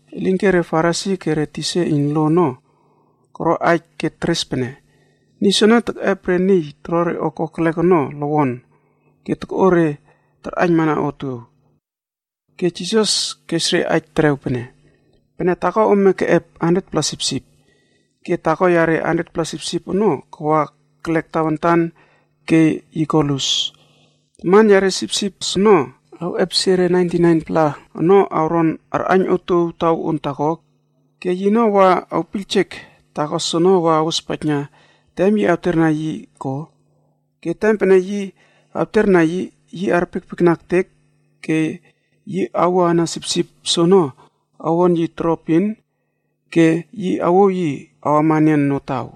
Elinke re Farisi ke re tisa iyn lo ono koro aij ke teres pene, “Niy soene tekꞌep re niy toro re o kokelek ono lowon ke tokꞌo re tarꞌaiynmana otuow.” Ke Jisas kes re aij terew pene: “Pene taako ome keꞌep 100-pla sipsip, ke taako yare 100-pla sipsip ono kawa kelek tawantan ke yi ko lus. Taman yare sipsip soono, awꞌepesie re 99-pla ono awron arꞌaiyn otuow taw on taako ke yino wa awpiyljek taako soono awa awospaijna tem yi awterna yi, ko? Ke tem pene yi awterna yi, yi arpiekpiekna ektek ke yi awoꞌana sipsip soono awon yi toroepin ke yi awouw yi awama enian notaw.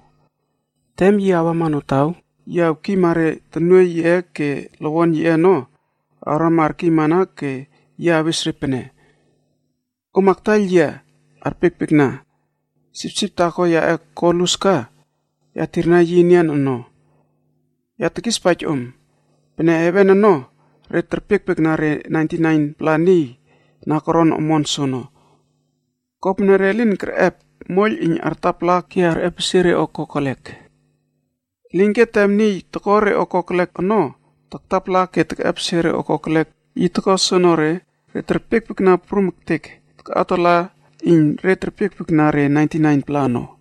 Tem yi awama notaw, yi awkiyma re tonuoiy yiꞌe ke lowon yiꞌe ono awrama arkiymana ke yi awes re pene, ‘Om aktaiyl yia arpiekpiekna, sipsip taako yaꞌe ko lus ka, ya tirna yi enian ono.’ Ya tekispaij om pene, heven ono, re terpiekpiekna re 99-pla niy na koron omon soono, kopene re lin kerꞌep moiyl iyn artapala ke arꞌepesie re o kokelek. Elinke tem niy toko re o kokelek ono taktapala ke tekꞌepesie re o kokelek yi toko soonore, re terpiekpiekna prum ektek takꞌawtala iyn re terpiekpiekna re 99-pla ono.”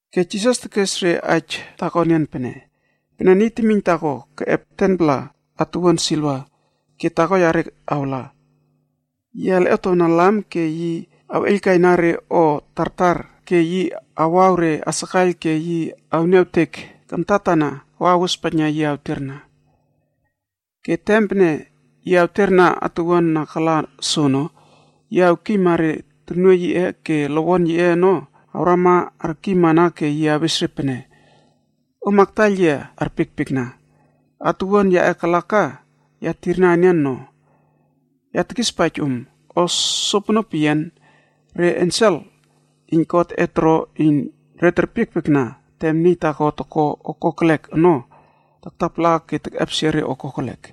Ke Jisas tekes re aij taako enian pene, “Pene niy temiyn taako keꞌep 10-pla atuwuan siliva ke taako yare awla. Yi alꞌietowna lam ke yi awꞌeiylkaina re o tartar ke yi awaw re asakaiyl ke yi awniawtek kamtatana wa awospaijna yi tawterna. Ke tem pene yi awterna atuwuan na kala soono, yi awkiyma re tonuoiy yiꞌe ke lowon yiꞌe ono awrama arkiymana ke yi awes re pene, ‘Om aktaiyl yia arpiekpiekna, atuwuan yaꞌe kala ka, ya tirna enian no.’ Ya tekispaij om, o sopono peyian, re ensel iyn Godꞌe toro iyn re terpiekpiekna tem niy taako toko re o kokelek ono taktapala ke tekꞌepesie re o kokelek.”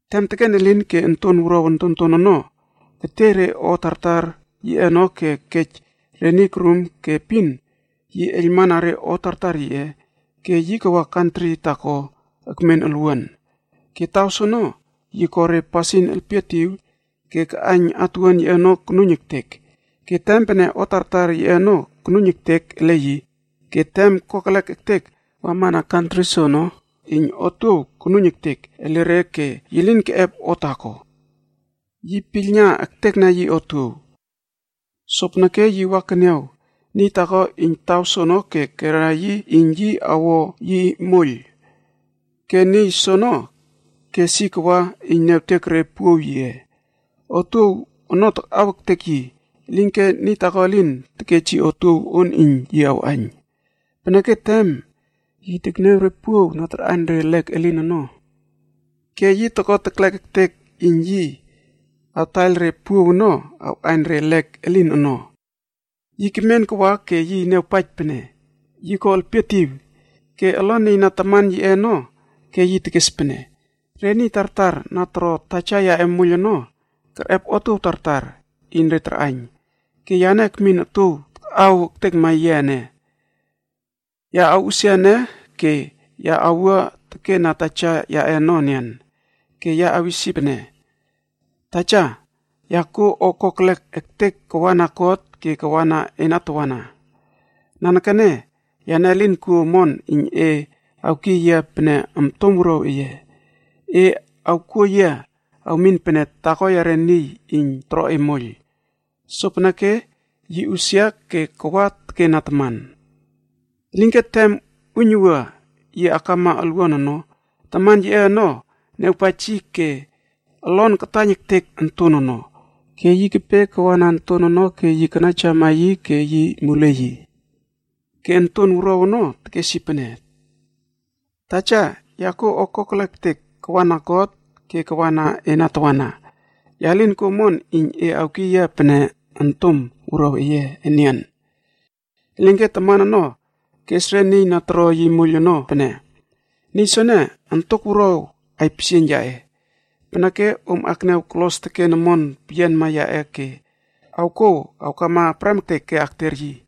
“Tem teken elin ke onton wuruaw ontonton ono ketiey re o tartar yiꞌe ono ke kej re niy korum ke epin yi eiylmana re o tartar yiꞌe, ke yi kawa kantri taako ekmen olwuan. Ke taw soono yi ko re pasin elpietiw ke kaꞌaiyn atuwuan yiꞌe ono konuiyn ektek. Ke tem pene o tartar yiꞌe ono konuiyn ektek ele yi, ke tem kokelek ektek wamana kantri soono iyn otuow konuiyn ektek ele re ke yi lin keꞌep o taako. Yi piylna ektekna yi otuow. Sopeneke yi wa keniaw niy taako iyn taw soono ke kera yi iyn yi awo yi moiyl. Ke niy soono kes yi kawa iyn niawtek re puow yiꞌe. Otuow ono takꞌaw ektek yi, elinke niy taako elin tekej yi otuow on iyn yi awꞌaiyn. Peneke tem yi tekniaw re puow na tarꞌaiyn re lek elin ono ke yi toko teklek ektek iyn yi awtaiyl re puow ono awꞌaiyn re lek elin ono. “Yi kemen kawa ke yi niawpaij pene yi ko elpietiw ke olon nieyna taman yiꞌe ono ke yi tekes pene, ‘Re niy tartar na toro taja yaꞌe moiyl ono, kerꞌep otuow tartar iyn re tarꞌaiyn. Ke yane ekmin otuow takꞌaw ektekma yia ene. Ya awꞌusia ene ke ya awua teken na taja yaꞌe ono enian, ke ya awis yi pene, “Taja, ya kuo o kokelek ektek kawana God ke kawa ena tawana. Nanekene yane elin kuo omon iyn e awkiy yia pene ontom wuruaw eye. E awkuo yia awmin pene taako yare niy iyn toro e moiyl.” ’ Sopeneke yi usia ke kawa teken na taman. “Elinke tem uiynuwua yi akama olwuan ono, taman yiꞌe ono niawpaij yi ke olon kataiyn ektek onton ono. Ke yi kepe kawana onton ono ke yi kanaijawama yi ke yi muliey yi. “Ke onton wuruaw ono tekes yi pene, ‘Taja, ya kuo o kokelek ektek kawana God ke kawana ena tawana. Ya lin kuo omon iyn e awkiy yia pene ontom wuruaw eye enian.’ “Elinke taman ono kes re niy na toro yi moiyl ono pene, ‘Niy soene, ontok wuruaw aipisieiyn yaꞌe. Peneke, om akniaw kolos teken omon peyianma yaꞌe ke awkouw awkama prem ektek ke akter yi.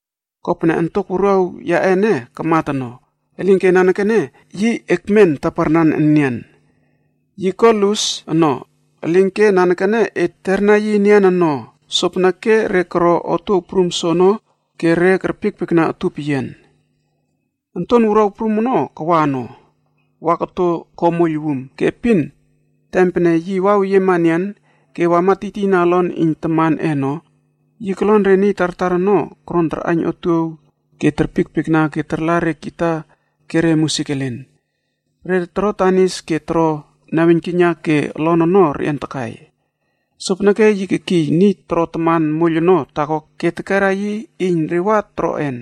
Kopene ontok wuruaw yaꞌe ene kamat ono, elinke nanekene yi ekmen taparnan enian, yi ko lus ono, elinke nanekene et teterna yi enian ono.’ Sopeneke re koro otuow prum soono ke re kerpiekpiekna utup peyian. “Onton wuruaw prum ono kawa wa koto ko moiyl wum. Ke epin tem pene yi waweyiema enian ke kej wama tiytiyna olon iyn tamanꞌe ono. Yi kolon re niy tartar ono koron tarꞌaiyn otuow ono ke aij takai ke terpiekpiekna ke tarla re kita ke re musik elen. Re toro danis ke toro naweiynkiyna ke toro olon ono reꞌian takai. Sopeneke yi kekiy niy toro taman moiyl ono taako ke tekera yi iyn re wa toroꞌen.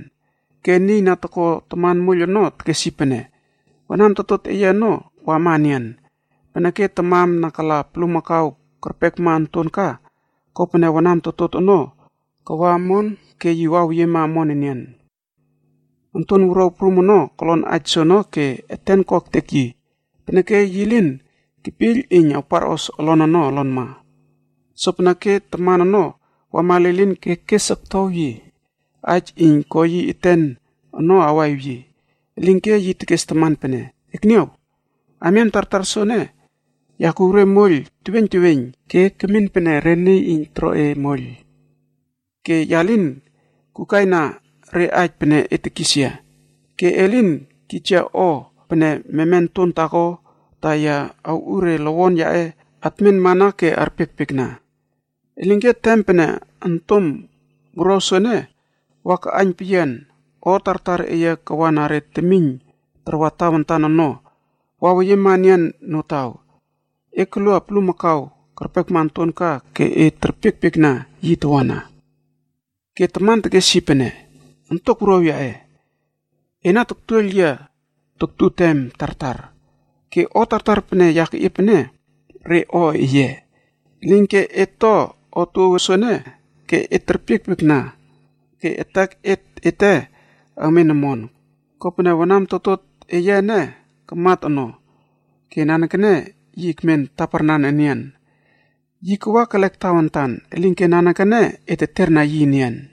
Ke niy na toko taman moiyl ono tekes yi pene, ‘Wanam totot eye ono wama enian, peneke tamam na kala bulmakau kerpekma onton ka, kopene wanam totot ono kawa omon ke yi waweyiema enian omon.’ “Onton wuruaw prum ono kolon aij soono ke eten ko ektek yi, peneke yi lin kepiyl iyn awparꞌos olon olonma. Sopeneke taman ono wama lilin ke kes oktow yi aij iyn ko yi eten ono awaꞌiw yi. Elinke yi tekes taman pene, ‘Ekniaw! Amiam tartar soene, ya kuw re moiyl teweiyn teweiyn ke kemin pene re niy toro e moiyl ke ya lin kukaina re aij pene e tekis yia. Ke e lin kij yia o pene meme onton taako, ta ya awꞌu re lowon yaꞌe atmen mana ke arpiekpiekna. Elinke, tem pene ontom wuruaw soene wa kaꞌaiyn peyian o tartar eye kawana re temiyn tarwa tawantan ono waweyiema enian notaw, e kolua bulmakau kerpekma onton ka ke e terpiekpiekna yi tawana.’ “Ke taman tekes yi pene, ‘Ontok wuruaw yaꞌe, ena taktuoiyl yia toktu tem tartar, ke o tartar pene ya keꞌiep ene, re o eye. Elinke, et to otuow soene ke et terpiekpiekna ke etek ete awmen omon, kopene wanam totot eye ene kamat ono ke nanekene yi ekmen taparnan enian. Yi kawa kelek tawantan elinke nanekene et teterna yi enian.’”